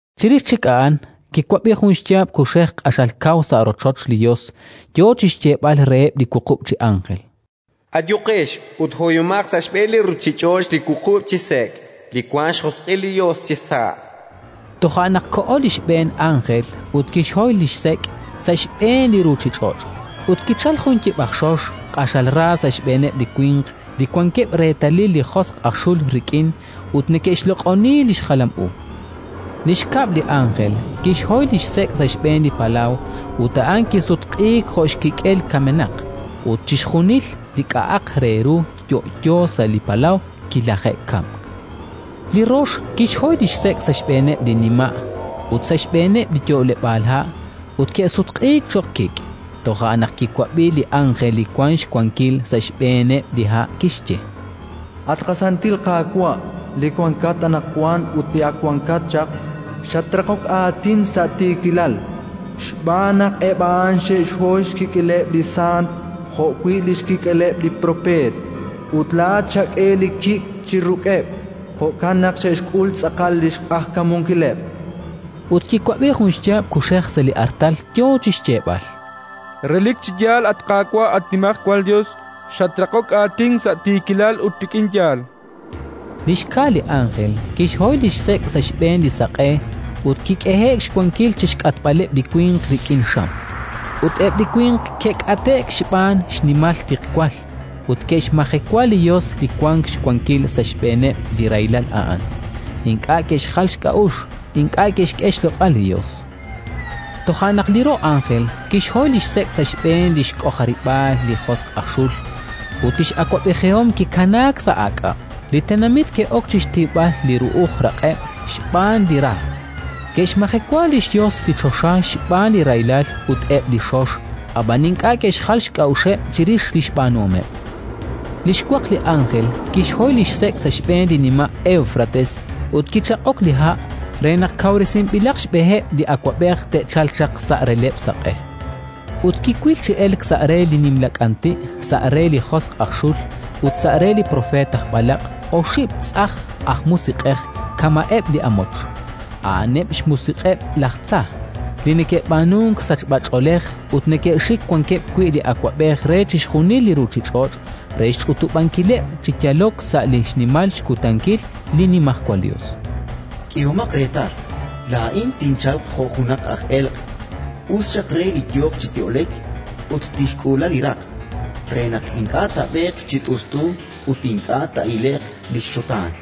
Chirix chik a'an kiwab'i jun xyaab' kuxej q'axal kaw sa' rochoch li Yos, yo chi xyeeb'al reheb' li wuqub' chi ánjel: “Ayuqex ut hoyomaq sa' xb'een li ruuchich'och' li wuqub' chi sek', li wank xjosq'il li Yos chisa'”. Eb' li wuqub' chi sek' Toja' naq koho li xb'een ánjel ut kixhoy li xsek' sa' xb'een li ruuchich'och'; ut kichalk jun yiib' aj xox, q'axal ra, sa' xb'eeneb' li winq li wankeb' reetalil li josq' aj xul rik'in ut neke'xloq'oni li xjalam u. Li xkab' li ánjel kixhoy li xsek' sa' xb'een li palaw, ut a'an kisutq'iik jo' xkik'el kamenaq, ut chixjunil li k'a'aq re ru yo'yo sa' li palaw kilaje'kamk. Li rox kixhoy li xsek' sa' xb'eeneb' li nima' ut sa' xb'eeneb' li yo'leb'aal ha', ut ke'sutq'iik cho'q kik'. Toja' naq kiwab'i li ánjel li wank xwankil sa' xb'eeneb' li ha', kixye: “At qasantil Qaawa', li wankat anaqwan ut li ak wankat chaq, xatraqok aatin sa' tiikilal, xb'aan naq eb' a'an xe'xhoy xkik'eleb' li sant jo'wi' li xkik'eleb' li propeet, ut laa'at xak'e li kik' chi ruk'eb': jo'kan naq xe'xk'ul tz'aqal xq'ajkamunkileb'”. Ut kiwab'i jun xyaab' kuxej sa' li artal yo chi xyeeb'al: “Relik chi yaal, at Qaawa', at Nimajwal Yos, xatraqok aatin sa' tiikilal ut rik'in yaal”. Li xka li ánjel kixhoy li xsek' sa' xb'een li saq'e, ut kik'ehe'k xwankil chi xk'atb'aleb' li winq rik'in xam. Ut eb' li winq ke'k'ate'k xb'aan xnimal tiqwal, ut ke'xmajewa li Yos li wank xwankil sa' xb'eeneb' li rahilal a'an: ink'a' ke'xjal xk'a'uxl, ink'a' ke'xk'e xloq'al li Yos. Toja' naq li ro' ánjel kixhoy li xsek' sa' xb'een li xk'ojarib'aal li josq' aj xul. Ut li x'awab'ejihom kikanaak sa' aak'ab'. Li tenamit ke'ok chi xtiwb'al li ru'uj raq'eb' xb'aan li ra, ke'xmajewa li xYos li choxa xb'aan li rahilal ut eb' li xox, ab'an ink'a' ke'xjal xk'a'uxeb' chirix li xb'aanuhomeb'. Li xwaq li ánjel kixhoy li xsek' sa' xb'een li nima' Éwfrates, ut kichaqik li ha' re naq kawresinb'ilaq xb'eheb' li awab'ej te'chalq chaq sa' releb'l saq'e. Ut kiwil chi elk sa' re li nimla k'anti', sa' re li josq' aj xul ut sa' re li propeet aj b'alaq' oxib' tz'ajn aj musiq'ej kama'eb' li amoch. A'aneb' xmusiq'eb' laj tza, li neke'b'aanunk sachb'ach'oolej ut neke'xik wankeb' wi' li awab'ej re chixjunil li ruuchich'och' re xch'utub'ankileb' chi yalok sa' li xnimal xkutankil li Nimajwal Yos. “K'ehomaq reetal, laa'in tinchalq jo' junaq aj elq'. Us xaq re li yooq chi yo'lek ut tixk'uula li raq', re naq ink'a' taab'eeq chi t'ust'u ut ink'a' taa'ile'q li xxutaan”.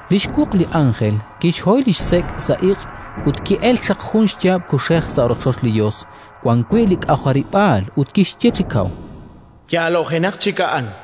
Li xwuq li ánjel kixhoy li xsek' sa' iq', ut ki'elk chaq jun xyaab' kuxej sa' rochoch li Yos, wan wi' li k'ojarib'aal, ut kixye chi kaw: “Yaalo'jenaq chik a'an!”.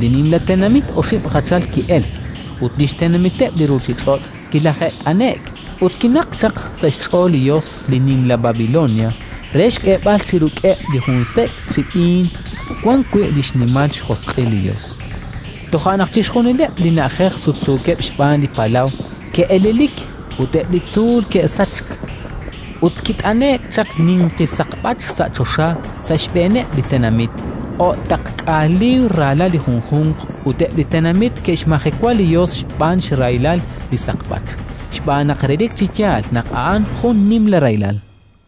Li Nimla Tenamit oxib' jachal ki'elk, ut li xtenamiteb' li ruuchich'och' kilaje't'ane'k; ut kinaqk chaq sa' xch'ool li Yos li nimla Babilonia re xk'eeb'al chi ruk'eb' li jun sek' chi b'iin wan wi' li xnimal xjosq'il. Toja' naq chixjunileb' li na'ajej sutsuukeb' xb'aan li palaw ke'elelik ut eb' li tzuul ke'sachk. Ut kit'ane'k chaq ninqi saqb'ach sa' choxa sa' xb'eeneb' li tenamit, o'taqk'aal liib'r raalal li junjunq; ut eb' li tenamit ke'xmajewa li Yos xb'aan xrahil li saqb'ach, xb'aan naq relik chi yaal naq a'an jun nimla rahilal.